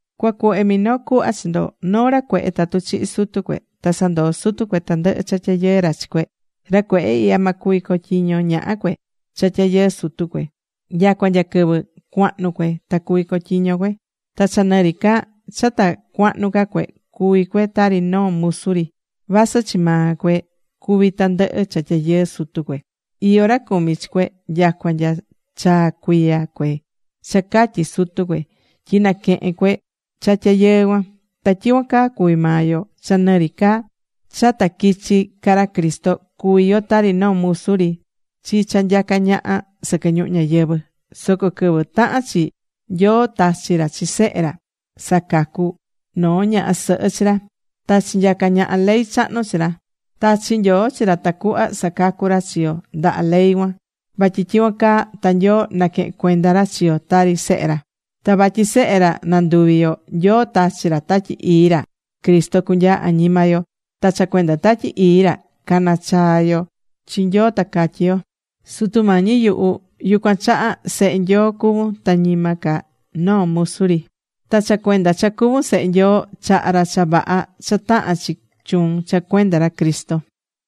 Cuacuhve minoo cuhva chi ndo. Noo ra cuehe tatu chihi̱ sutu cue, ta sandoo̱ sutu cue tandɨhɨ cha tyayɨɨ ra chi cue, ra cuehe ihya ma cuvi cotyiño ñaha cue cha tyayɨɨ sutu cue. Nyacua nya quɨvɨ cuahnu cue ta cuvi cotyiño cue. Ta cha nɨ ri ca cha ta cuahnu ca cue, cuví cue tari noo musu ri. Vasɨ chi maa cue cuví tandɨhɨ cha tyayɨɨ sutu cue. Iyó ra cumí chi cue nyacua nya chaa cuiya cue cha catyi̱ sutu cue, tyi naquehen cue cha tyayɨɨ cuan. Ta tyicuan caa cuvi̱ maa yo. Cha nɨ ri ca cha ta quichi̱ ca ra Cristo, cuvi̱ yo tari noo musu ri chi cha nyacá ñaha sɨquɨ ñuhu ñayɨvɨ̱. Soco quɨvɨ tahan chi, Nyoo tachi̱ ra chi Sehe ra, sacacu̱ noo ñaha sɨhɨ chi ra. Ta chinyacá ñaha ley chahnu chi ra. Tachi̱ Nyoo chi ra tacuhva sacacú ra chi yo ndaha ley cuan. Vatyi tyicuan caa ta Nyoo naquehén cuenda ra chi yo tari sehe ra. Ta vatyi sehe ra nanduvi̱ yo, Nyoo tachí ra Tatyi Ii ra Cristo cunyaa añima yo. Ta cha cuenda Tatyi Ii ra caná chaa yo chi Nyoo ta catyí yo: “Sutu Mañi yuhu.” Yucuan chaha sehe Nyoo cuvun ta ñima ca noo musu ri. Ta cha cuenda cha cuvún sehe Nyoo, chahá ra cha vaha cha tahán chi chuun cha cuenda ra Cristo.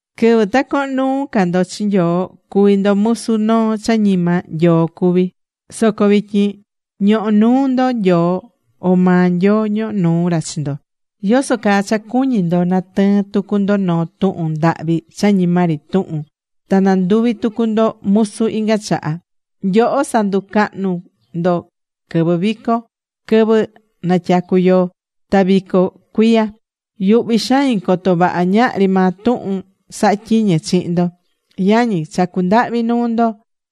Quɨvɨ ta cohon nuu ca ndo chi Nyoo, cuvi̱ ndo musu noo cha ñima Nyoo cuví. Soco vityin ñohó nuu ndo Nyoo, o maa Nyoo ñohó nuu ra chi ndo. ¿Yoso caa cha cuñí ndo natɨɨn tucu ndo noo tuhun ndahvi cha ñima ri tuhun, ta nanduvi tucu ndo musu inga chaha? Nyoho sanducahnú ndo quɨvɨ vico, quɨvɨ natyacú yoo, ta vico cuiya. Yuhví xain coto vaha ñahri maa tuhun sahá tyiñe chihin ndo. Yañi, chacú ndahvi nuu ndo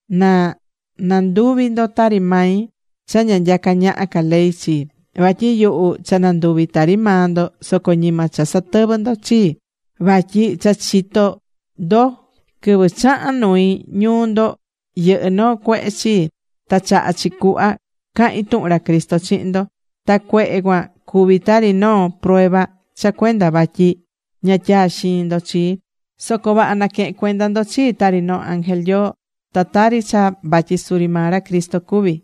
na nanduvi ndo tari mai (cha ña nyacá ñaha ca ley chii). Vatyi yuhu cha nanduvi̱ tari maa ndo, soco ñima cha satɨvɨ ndo chii. Vatyi cha chitó ndo quɨvɨ chaha̱n nui ñuu ndo yɨhɨ́ noo cuehe chii. Ta chaha̱ chi cuhva cahi̱n tuhun ra Cristo chihin ndo. Ta cuehe cuan cuvi̱ tari noo prueba cha cuenda vatyi ña tyaa xiin ndo chii. Soco vaha naquehe̱n cuenda ndo chii, tari noo ángel Nyoo, ta tari cha vatyi suri maa ra Cristo cuví.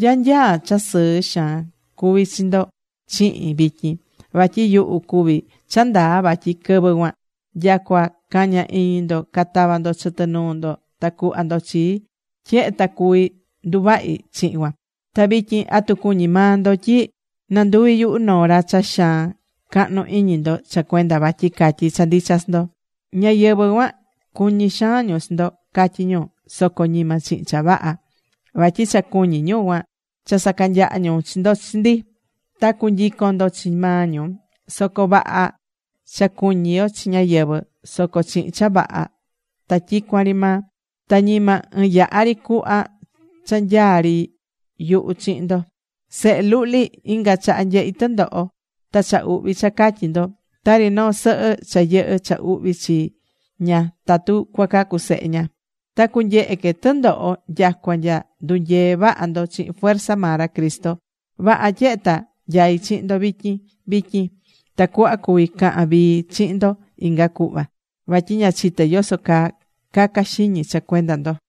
¿Nya nyaa cha sɨɨ xaan cuvi̱ chi ndo chihin vityin? Vatyi yuhu cuví cha ndaa vatyi quɨvɨ cuan, nyacua caña iñi ndo catava ndo chɨtɨ nuu ndo ta cuhva ndo chii, tyehe ta cuvi̱ nduvahi chihin cuan. Ta vityin, ¿atu cuñí maa ndo tyi nanduví yuhu noo ra cha xaan cahnu iñi ndo cha cuenda vatyi catyí cha ndicha chi ndo? Ñáyɨvɨ cuan, cuñí xaan ñu chi ndo, catyí ñu. Soco ñima chihin cha vaha. Vatyi cha cuñí ñu cuan, cha sacanyaha ñu chi ndo chi ndi. Ta cunyicon ndo chi maa ñu. Soco vaha cha cuñí yo chi ñáyɨvɨ, soco chihin cha vaha, ta tyicuan ri maa. Ta ñima ɨɨn yaha ri cuhva cha nyaa ri yuhu chihin ndo. Sehe luhli, inga chaha nyehí tɨndoho ta cha uhvi cha catyi ndo. Tari noo sɨhɨ cha yɨhɨ́ cha uhvi chi ña tatu cuacacu sehe ña. Ta cunyehe que tɨndoho nyacua nya ndunyee vaha ndo chihin fuerza maa ra Cristo. Vaha tyehe ta nyaí chihin ndo vityin vityin. Tacuhva cuví cahan vii chihin ndo inga cuhva. Vatyi ña chité yoso caa caca xiñi cha cuenda ndo.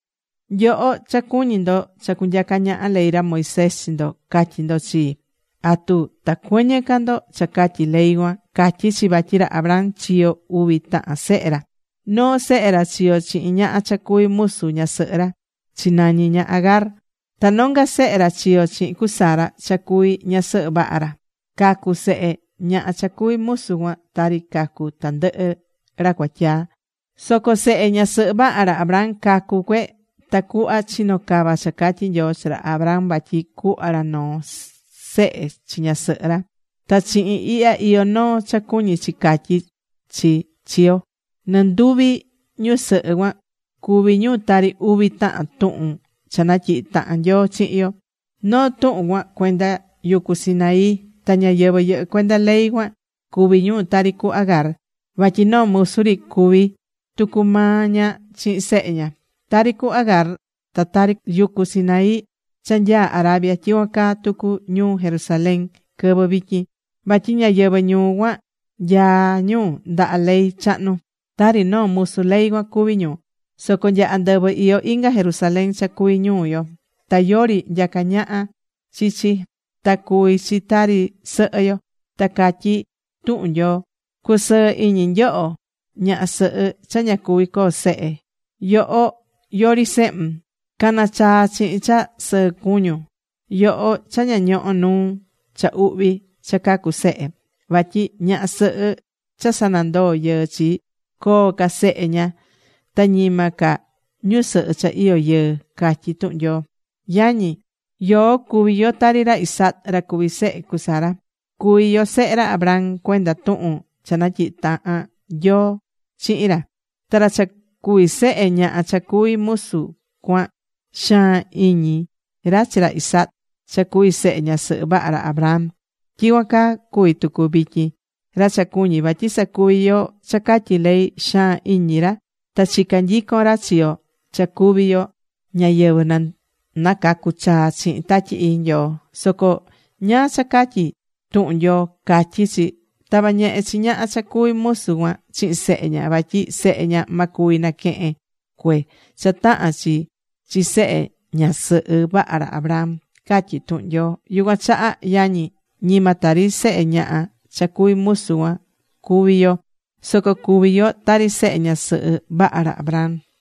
Nyoho cha cuñí ndo cha cunyaca ñaha ley ra Moisés chi ndo, ca̱tyi ndo chii. ¿Atu ta cuɨñɨ ca ndo cha catyí ley cuan? Catyí chi vatyi ra Abraham chiyo̱ uvi tahan sehe ra. Noo sehe ra chiyo̱ chihin ñaha cha cuvi̱ musu ñasɨhɨ ra. (Chinañi ña Agar.) Ta nonga sehe ra chiyo̱ chihin cu Sara cha cuvi̱ ñasɨhɨ vaha ra. Cacu̱ sehe ñaha cha cuví musu cuan tari cacú tandɨhɨ ra cuatyaa. Soco sehe ñasɨhɨ vaha ra Abraham cacu̱ cue tacuhva chino cava cha catyi̱ Nyoo chi ra Abraham vatyi cuhva ra noo sehe chi ñasɨhɨ ra. Ta chihin ihya iyó noo cha cuñi chi catyí chi chi yo. Nɨnduvi ñusɨhɨ cuan cuví ñu tari uvi tahan tuhun cha natyihi̱ tahan Nyoo chihin yo. Noo tuhun cuan cuenda yucu Sinaí. Ta ñáyɨvɨ yɨhɨ́ cuenda ley cuan cuví ñu tari cu Agar, vatyi noo musu ri cuvi̱ tucu maa ña chihin sehe ña. Tari cu Agar, ta tari yucu Sinaí cha nyaá Arabia, tyicuan caa tucu ñuu Jerusalén quɨvɨ vityin. Vatyi ñáyɨvɨ ñuu cuan nyaá ñu ndaha ley chahnu. Tari noo musu ley cuan cuví ñu. Soco nya andɨvɨ iyó inga Jerusalén, cha cuví ñuu yo. Ta yori nyacá naha chi chi. Ta cuví chi tari sɨhɨ yo. Ta catyi tuhun Nyoo: Cu̱sɨɨ iñi yoho, ñaha sɨhɨ cha ña cuví coo sehe. Yoho yori sehun. Ca̱na chaa chihin cha sɨɨ cuñun, yoho cha ña ñoho̱ nuu cha uhvi cha cacu sehe. Vatyi ñaha sɨhɨ cha sanandoo̱ yɨɨ chi, coo ca sehe ña ta ñima ca ñusɨhɨ cha iyó yɨɨ, catyí tuhun Nyoo. Yañi, yoó cuví yo tari ra Isaac, ra cuví sehe cu Sara. Cuví yo sehe ra Abraham cuenda tuhun cha natyihi̱ tahan Nyoo chihin ra. Ta ra cha cuvi̱ sehe ñaha cha cuví musu cuan xaan iñi ra chi ra Isaac cha cuvi̱ sehe ñasɨhɨ vaha ra Abraham. Tyicuan caa cuví tucu vityin. Ra cha cuñí vatyi sacuví yo cha catyí ley, xaan iñi ra ta chicán nyicon ra chi yo cha cuví yo ñáyɨvɨ nacacu̱ chaa chihin Tatyi Ii Nyoo. Soco ¿ñáá cha catyí tuhun Nyoo? Catyí chi: “Ta̱va ñehe chi ñaha cha cuví musu cuan chihin sehe ña. Vatyi sehe ña ma cuvi naquehen cue cha tahán chi chi sehe ñasɨhɨ vaha ra Abraham”, catyí tuhun Nyoo. Yucuan chaha, yañi, ñima tari sehe ñaha cha cuví musu cuan cuvi yo. Soco cuví yo tari sehe ñasɨhɨ vaha ra Abraham.